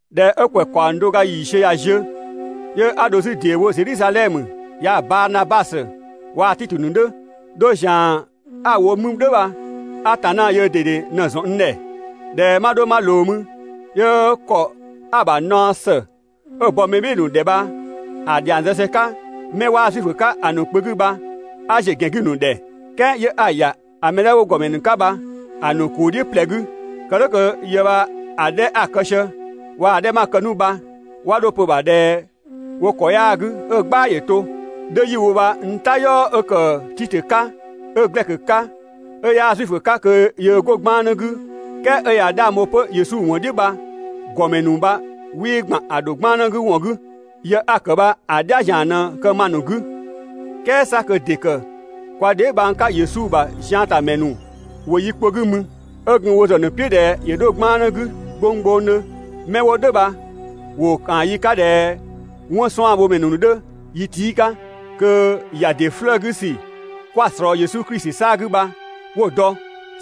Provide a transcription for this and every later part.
꞊Dhɛ 'ö ‑kwɛ ‑kaɔng do ga ‑yiisiö ꞊ya ziö, 'yö 'a dho 'zü ‑deewo Zedhizadhɛmö, yaa‑ Baanabasö waa‑ Titö ‑nu 'dhö. 'Dho ‑zian 'a‑ wo mü "dhʋ̈ bha, Atanna yöö ꞊dede ꞊në‑ ‑zɔn n ‑dhɛ. ꞊Dhɛ 'ma 'dho 'ma ꞊loo mü, 'yö ‑kɔ 'a‑ ‑bha naɔ ‑së 'ö‑ bɔ mɛ "bhɩɩ‑ ‑nu ‑dhɛ bha‑ ‑dhiang zë sië‑ 'ka 'mɛ 'waa Zuifö 'ka‑ ‑nu kpö 'gü bha 'a ‑ziö ‑gɛn 'gü‑ ‑nu ‑dhɛ, "kɛɛ 'yö 'a‑ ‑ya ‑a mɛ 'dhɛ 'wo ‑gɔmɛ ‑nu 'ka bha‑ ‑nu ‑kuu "dhiʋ̈ ꞊plɛ 'gü, kë "dhʋ̈ kö yë bha‑ 'dhɛ 'a‑ kë sië waa‑ 'dhɛ 'ma‑ kë 'nu bha ('wa 'dho‑ pö‑ ‑bha ꞊dhɛ wo ‑kɔ 'yaa‑ 'gü ö‑) "gbaa ‑yö to. 'Dho 'yi‑ wo bha n "tayɔɔ 'ö ‑kë Titö 'ka, 'ö Glɛkö 'ka, ('ö 'yaa Zuifö 'ka kö yöö 'go 'gbannë 'gü, "kɛɛ 'ö ꞊ya 'dhang bho 'pö Yesu ‑wɔn "dhiʋ̈) bha, ‑gɔmɛ ‑nu bha 'wii ‑gban ‑a ‑dho 'gbannë 'gü ‑wɔn 'gü, (yë 'a‑ ‑kë bha‑ "dhia ‑zian ꞊në kë ma‑ ‑nu 'gü). "Kɛɛ 'sa kö ‑dɩ ‑kë kwa dheebhang 'ka Yesu ‑bha ziantamɛ ‑nu ‑wo yi kpö 'gü mü 'ö gun wo ‑zë ‑nu "piʋ̈ ꞊dhɛ ‑yö 'dho 'gbannë 'gü gbonggbongdhö. Mɛ 'wo "dhʋ̈ bha ‑wo ‑kaan yi 'ka ꞊dhɛ 'wɔnsuanbhomɛ ‑nu 'dhö yi tii' 'ka, kö ‑ya ‑dɩ 'flëë‑ 'gü ‑sü 'kwa‑ ꞊slɔɔ Yesu Klisi 'saa‑ 'gü bha 'wo‑ dɔ.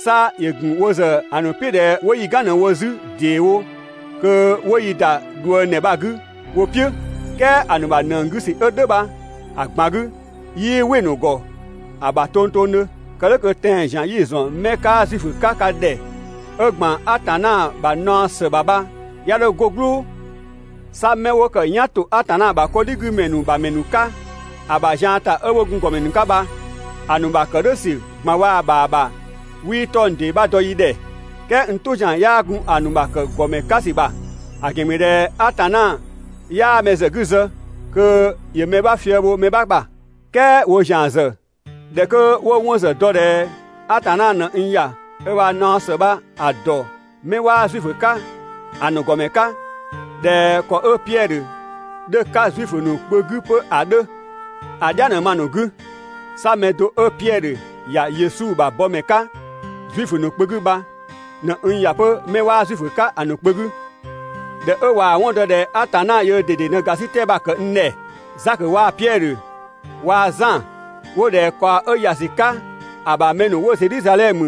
'Sa ‑yö ‑gun wo ‑zë ‑a ‑nu "piʋ̈ 'nu ꞊dhɛ 'wo yi "gan ꞊në‑ wo 'zü ‑deewo kö 'wo yi ‑da ꞊dhuëngdhɛ bha‑ 'gü wo "piʋ̈. "Kɛɛ ‑a ‑nu ‑bha ‑nëng 'gü ‑sü 'ö "dhʋ̈ bha‑ ꞊gban 'gü 'yii‑ "wɩ‑ ‑nu ‑gɔ ‑bha tongtongdhö, kë "dhʋ̈ kö tɛan‑ ‑zian 'yi‑ ‑zɔn 'mɛ 'kaa Zuifö 'ka ka ‑dhɛ 'ö ‑gban Atanna ‑bha naɔ ‑së ‑bha bha 'ya 'dho 'go "gblʋʋ. 'Sa 'mɛ 'wo ‑kë "yan ‑to Atanna ‑bha 'kɔdhigümɛ ‑nu ‑bha ‑mɛ ‑nu 'ka ‑a ‑bha zian ‑ta 'ö 'wo gun ‑gɔmɛ ‑nu 'ka bha, ‑a ‑nu ‑bha ‑kë "dhʋ̈ ‑sü ꞊gban waa‑ ‑bha ‑bha 'wii 'tɔng‑ ‑dee 'bha dɔ yi ‑dhɛ, "kɛɛ n "tʋ ‑zian 'yaa gun‑ ‑nu ‑bha ‑kë ‑gɔmɛ 'ka ‑sü ‑bha, ‑a ‑gɛn ‑mü ꞊dhɛ Atanna 'yaa mɛ ‑zë 'gü zë kö ‑yö mɛ 'bha fië‑ bho mɛ 'bha ‑bha. "Kɛɛ woo ‑zian ‑zë, ꞊dhɛ 'kö 'wo‑ 'wɔn ‑zë dɔ ꞊dhɛ Atanna ꞊në n ‑ya ö ‑bha naɔ ‑së bha‑ ‑dɔ mɛ 'waa Zuifö 'ka ‑a ‑nu ‑gɔmɛ 'ka, ꞊dhɛ ‑kɔ 'ö Piɛdhö 'dhö‑ 'ka Zuifö ‑nu kpö 'gü 'pö ‑a 'dhö, ‑a "dhia ꞊në ma‑ ‑nu 'gü. 'Sa mɛ do 'ö Piɛdhö ‑ya Yesu ‑bha bɔmɛ 'ka Zuifö ‑nu kpö 'gü bha ꞊në n ‑ya 'pö 'mɛ 'waa Zuifö 'ka‑ ‑nu kpö 'gü. ꞊Dhɛ 'ö ꞊waa‑ 'wɔn dɔ ꞊dhɛ Atanna yöö ꞊dede ꞊në ‑gasitɛ bha‑ ‑kë n ‑dhɛ, Zakö waa‑ Piɛdhö waa‑ Zan 'wo ꞊dhɛ ꞊kaɔ 'ö ‑ya ‑sü 'ka ‑a ‑bha mɛ ‑nu 'wo Zedhizadhɛmö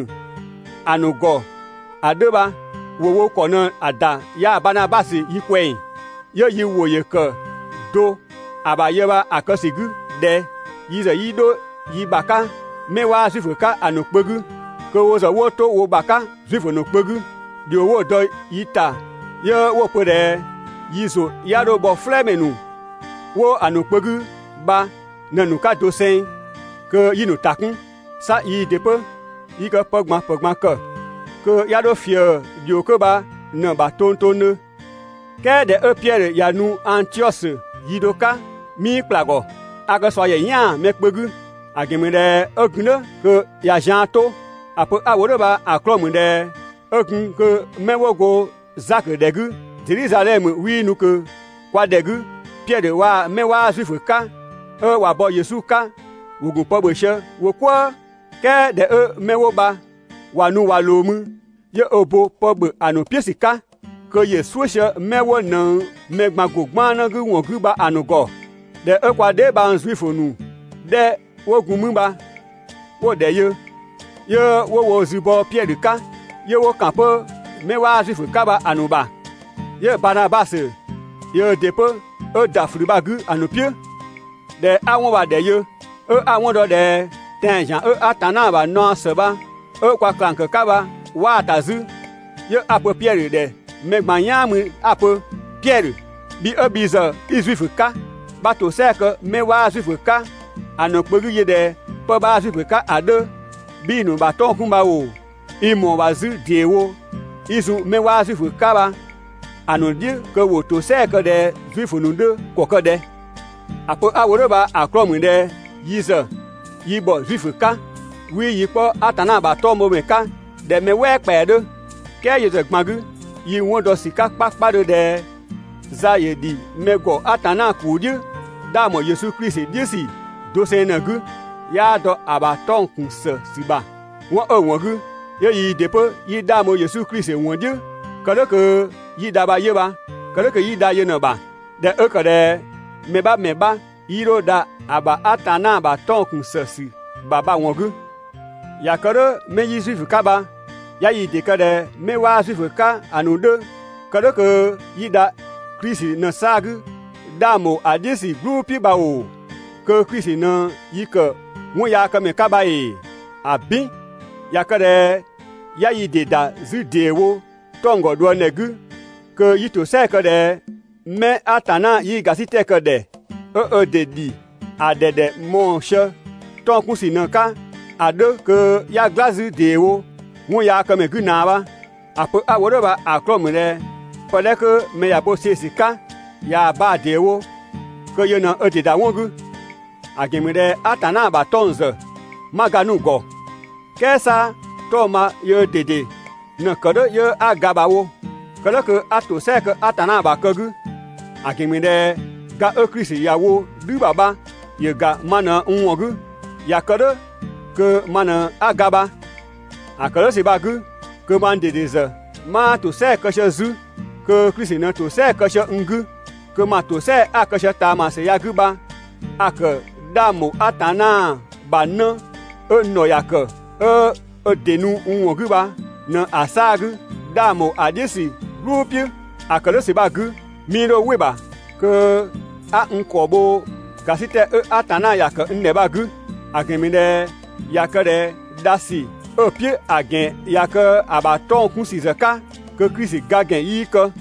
‑a ‑nu ‑gɔ ‑a 'dhö bha, ‑wo wo ‑kɔ ꞊në‑ ‑da yaa‑ Baanabasö yi ꞊kwɛng, 'yö yi ‑wʋ ‑yö ‑kë do ‑a ‑bha yë bha‑ kë ‑sü 'gü ꞊dhɛ: yi ‑zë 'yi 'dho yi ‑bha 'ka 'mɛ 'waa Zuifö 'ka‑ ‑nu kpö 'gü, kö wo ‑zë 'wo 'to wo ‑bha 'ka Zuifö ‑nu kpö 'gü. ‑Dhio 'wo‑ dɔ yi ‑ta 'yö 'wo‑ pö ꞊dhɛ yi ‑zʋ 'ya 'dho bhɔ "flɛɛmɛ ‑nu 'wo‑ ‑nu kpö 'gü bha ꞊në‑ ‑nu 'ka doseng kö 'yi‑ ‑nu ‑ta 'kun. 'Sa yii ‑dɩ 'pö yi kë pë ꞊gban ‑pë ꞊gban ‑kë kö 'ya 'dho ꞊fië ‑dhio 'ko bha ꞊në‑ ‑bha tongtongdhö. "Kɛɛ ꞊dhɛ 'ö Piɛdhö ꞊ya nu Angtiɔsö yi do 'ka, 'mii ‑kpla ‑gɔ, a kë ꞊sua ‑yɛ "yan‑ mɛ kpö 'gü. ‑A ‑gɛn ‑mü ꞊dhɛ 'ö gun "dhʋ̈ kö ꞊ya zian 'to. ‑A pö 'a‑ wo "dhʋ̈ bha‑ 'klɔɔ‑ ‑mü ꞊dhɛ 'ö gun kö 'mɛ 'wo go Zakö ‑dhɛ 'gü Zedhizadhɛmö 'wii nu ꞊kö kwa ‑dhɛ 'gü, Piɛdhö waa‑ 'mɛ 'waa Zuifö 'ka 'ö ꞊wa bɔ Yesu 'ka ‑wo ‑gun pë ‑bhö sië wo "kwëë, "kɛɛ ꞊dhɛ 'ö 'mɛ 'wo bha ꞊wa nu ꞊wa ꞊loo mü, 'yö ö bo pë ‑bhö ‑a ‑nu "piʋ̈ ‑sü 'ka, kö ‑yö "suʋ̈ sië 'mɛ 'wo ꞊nëng mɛ ꞊gban ‑go 'gbannë 'gü ‑wɔn 'gü bha‑ ‑nu ‑gɔ. ꞊Dhɛ 'ö kwa dheebhang Zuifö ‑nu 'dhɛ 'wo gun mü bha 'wo‑ ‑dhɛ yö, 'yö 'wo wo zü bɔ Piɛdhö 'ka, 'yö 'wo ‑kan 'pö 'mɛ 'waa Zuifö 'ka bha‑ ‑nu ‑bha. 'Yö Baanabasö yöö ‑dɩ 'pö 'ö ‑da ꞊flü bha‑ 'gü‑ ‑nu "piʋ̈. ꞊Dhɛ 'a 'wɔn bha‑ ‑dhɛ yö, 'ö 'a‑ 'wɔn dɔ ꞊dhɛ tɛan‑ ‑zian 'ö Atanna ‑bha naɔ ‑së bha 'ö kwa ꞊klang ‑kë 'ka bha 'waa‑ ‑ta 'zü, 'yö 'a‑ pö Piɛdhö ‑dhɛ mɛ ꞊gban "yaan mü 'a‑ pö: «Piɛdhö, bhi 'ö bhi ‑zë 'i Zuifö 'ka, 'bha ‑tosɛa kë 'mɛ 'waa Zuifö 'ka‑ ‑nu kpö 'gü yö ꞊dhɛ 'pë 'bhaa Zuifö 'ka ‑a 'dhö, 'bhii‑ ‑nu ‑bha 'tɔng‑ 'kun bha ‑oo, i ‑mɔɔ ‑bha 'zü ‑deewo i zun 'mɛ 'waa Zuifö 'ka bha‑ ‑nu "dhiʋ̈ kö ‑wo ‑tosɛa kë ꞊dhɛ Zuifö ‑nu 'dhö ‑kɔ ‑kë ꞊dhɛ?» ‑A pö 'a‑ wo "dhʋ̈ bha‑ 'klɔɔ‑ ‑mü ꞊dhɛ yi ‑zë yi ‑bhɔ Zuifö 'ka, 'wii yi 'kpɔ Atanna ‑bha 'tɔngbhomɛ 'ka ꞊dhɛ mɛ "wɛɛ ‑kpɛa 'dhö. "Kɛɛ yö ‑zë ꞊gban 'gü yi‑ 'wɔn dɔ ‑sü 'ka 'kpakpadhö ꞊dhɛ za ‑yö ‑dhi mɛ ‑gɔ Atanna ‑kuu "dhiʋ̈ 'dhang ‑bho Yesu Klisi "dhiʋ̈ ‑sü doseng ꞊në‑ 'gü, 'yaa dɔ ‑a ‑bha 'tɔng‑ ‑kun ‑së ‑sü ‑bha. 'Wɔn 'ö‑ ‑wɔn 'gü 'yö yii ‑dɩ 'pö 'yi 'dhang bho Yesu Klisi ‑wɔn "dhiʋ̈ kë "dhʋ̈ kö 'yi dha bha 'yö bha, kë "dhʋ̈ kö 'yi dha yö ꞊në‑ ‑bha, ꞊dhɛ 'ö ‑kë ꞊dhɛ mɛ 'bha ‑mɛ 'bha 'yii 'dho dha ‑a ‑bha Atanna ‑bha 'tɔng‑ ‑kun ‑së ‑sü ‑bha bha‑ ‑wɔn 'gü. ꞊Ya kë "dhʋ̈ 'mɛ 'yi Zuifö 'ka bha 'ya yi ‑dɩ kë ꞊dhɛ 'mɛ 'waa Zuifö 'ka‑ ‑nu 'dhö kë "dhʋ̈ kö 'yi dha Klisi ꞊në‑ 'saa‑ 'gü 'dhang ‑bho ‑a "dhiʋ̈ ‑sü "gblʋ̈ "piʋ̈ bha ‑oo, kö Klisi ꞊në yi ‑kë 'wɔnyaakëmɛ 'ka bha ‑ee? ‑Abin! ꞊Ya kë ꞊dhɛ 'ya yi ‑dɩ ‑da 'zü ‑deewo 'tɔng‑ ‑gɔ ꞊dhuëngdhɛ 'gü kö 'yi ‑tosɛa kë ꞊dhɛ 'mɛ Atanna 'yii ‑gasitɛ kë‑ ‑dhɛ, 'ö ö ‑dɩ ‑dhi ‑a ‑dhɛ ‑dhɛ mɔɔ‑ sië 'tɔng‑ 'kun ‑sü ꞊në‑ 'ka ‑a 'dhö kö 'ya "gla 'zü ‑deewo 'wɔnyaakëmɛ 'gü ꞊naa bha. ‑A pö 'a‑ wo "dhʋ̈ bha‑ 'klɔɔ‑ ‑mü ꞊dhɛ pë 'dhɛ 'kö mɛ ꞊ya bo‑ see‑ ‑sü 'ka, ꞊yaa‑ baa‑ ‑dee wo kö yö ꞊në ö ‑dɩ ‑da 'wɔn 'gü. ‑A ‑gɛn ‑mü ꞊dhɛ Atanna ‑bha 'tɔng‑ ‑zë 'ma ga 'nu‑ ‑gɔ, "kɛɛ 'sa 'tɔng‑ bha yöö ꞊dede ꞊në‑ ‑kë "dhʋ̈ 'yö 'a ga bha‑ wo, kë "dhʋ̈ kö 'a ‑tosɛa kë Atanna ‑bha ‑kë 'gü, ‑a ‑gɛn ‑mü ꞊dhɛ ga 'ö Klisi ‑ya wo "dhü ‑bha bha ‑yö ‑ga ma ꞊në n ‑wɔn 'gü, ꞊ya kë "dhʋ̈ kö ma ꞊në 'a ga bha. ‑A kë "dhʋ̈ ‑sü bha‑ 'gü kö mang ꞊dede ‑zë 'maa ‑tosɛa kë sië 'zü, 'kö Klisi ꞊në ‑tosɛa kë sië n 'gü, kö ma ‑tosɛa a‑ kë sië ꞊taamasü ya‑ 'gü bha a‑ ‑kë 'dhang ‑bho Atanna ‑bha 'në 'ö n ‑dhɔ ‑ya ‑kë 'ö ö ‑dɩ nu n ‑wɔn 'gü bha ꞊në‑ 'saa‑ 'gü 'dhang ‑bho ‑a "dhiʋ̈ ‑sü "gblʋ̈ "piʋ̈. ‑A ‑kë "dhʋ̈ ‑sü bha‑ 'gü, 'mii 'dho "wɩ‑ ‑bha kö 'a n ‑kɔ bho ‑gasitɛ 'ö Atanna ‑ya ‑kë n ‑dhɛ bha‑ 'gü. ‑A ‑gɛn ‑mü ꞊dhɛ ꞊ya kë ꞊dhɛ dha ‑sü 'ö‑ "piʋ̈ ‑a ‑gɛn ꞊ya kë ‑a ‑bha 'tɔng‑ 'kun ‑sü ‑zë 'ka, kö Klisi ga ‑gɛn 'yii kë.